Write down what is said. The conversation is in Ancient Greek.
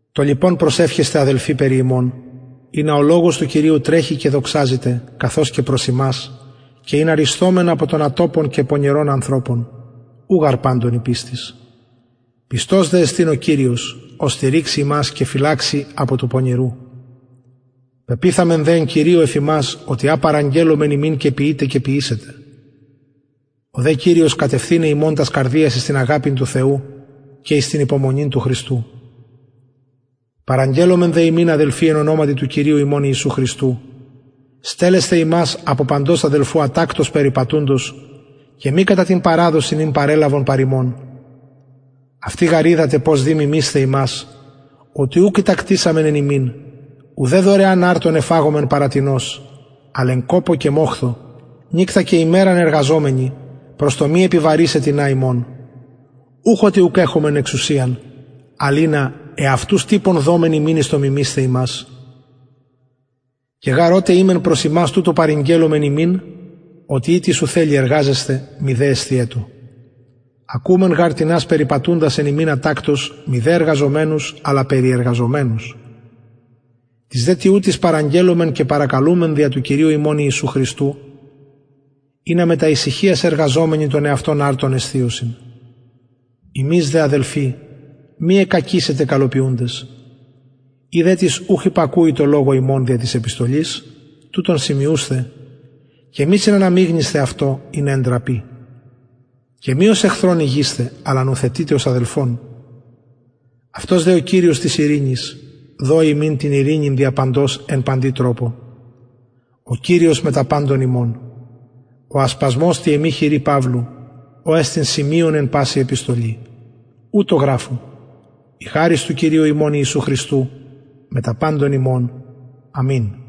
το λοιπον προσευχεσθε αδελφοι περι ημων ινα ο λογος του κυριου τρεχη και δοξαζηται καθως και προς υμας και ινα ρυσθωμεν απο των ατοπων και πονηρων ανθρωπων ου γαρ παντων η πιστις πιστος δε εστιν ο κυριος ος στηριξει υμας και φυλαξει απο του πονηρου πεποιθαμεν δε εν κυριω εφ υμας οτι α παραγγελλομεν υμιν και ποιειτε και ποιησετε ο δε κυριος κατευθυναι υμων τας καρδιας εις την αγαπην του θεου και εις την υπομονην του χριστου παραγγελλομεν δε υμιν αδελφοι εν ονοματι του κυριου ημων ιησου χριστου στελλεσθαι υμας απο παντος αδελφου ατακτως περιπατουντος και μη κατα την παραδοσιν ην παρελαβον παρ ημων αυτοι γαρ οιδατε πως δει μιμεισθαι ημας οτι ουκ ητακτησαμεν εν υμιν ουδε δωρεαν αρτον εφαγομεν παρα τινος αλλ εν κοπω και μοχθω νυκτα και ημεραν εργαζομενοι προς το μη επιβαρησαι τινα υμων ουχ οτι ουκ εχομεν εξουσιαν αλλ ινα εαυτους τυπον δωμεν υμιν εις το μιμεισθαι ημας και γαρ οτε ημεν προς υμας τουτο παρηγγελλομεν υμιν οτι ει τις ου θελει εργαζεσθαι μηδε εσθιετω ακουομεν γαρ τινας περιπατουντας εν υμιν ατακτως μηδεν εργαζομενους αλλα περιεργαζομενους τοις δε τοιουτοις παραγγελλομεν και παρακαλουμεν δια του κυριου ημων ιησου χριστου ινα μετα ησυχιας εργαζομενοι τον εαυτων αρτον εσθιωσιν υμεις δε αδελφοι μη εκκακησητε καλοποιουντες ει δε τις ουχ υπακουει τω λογω ημων δια της επιστολης τουτον σημειουσθε και μη συναναμιγνυσθε αυτω ινα εντραπη και μη ως εχθρον ηγεισθε αλλα νουθετειτε ως αδελφον αυτος δε ο κυριος της ειρηνης δωη υμιν την ειρηνην δια παντος εν παντι τροπω ο κυριος μετα παντων υμων ο ασπασμος τη εμη χειρι παυλου ο εστιν σημειον εν παση επιστολη ουτως γραφω η χαρις του κυριου ημων ιησου χριστου μετα παντων υμων αμην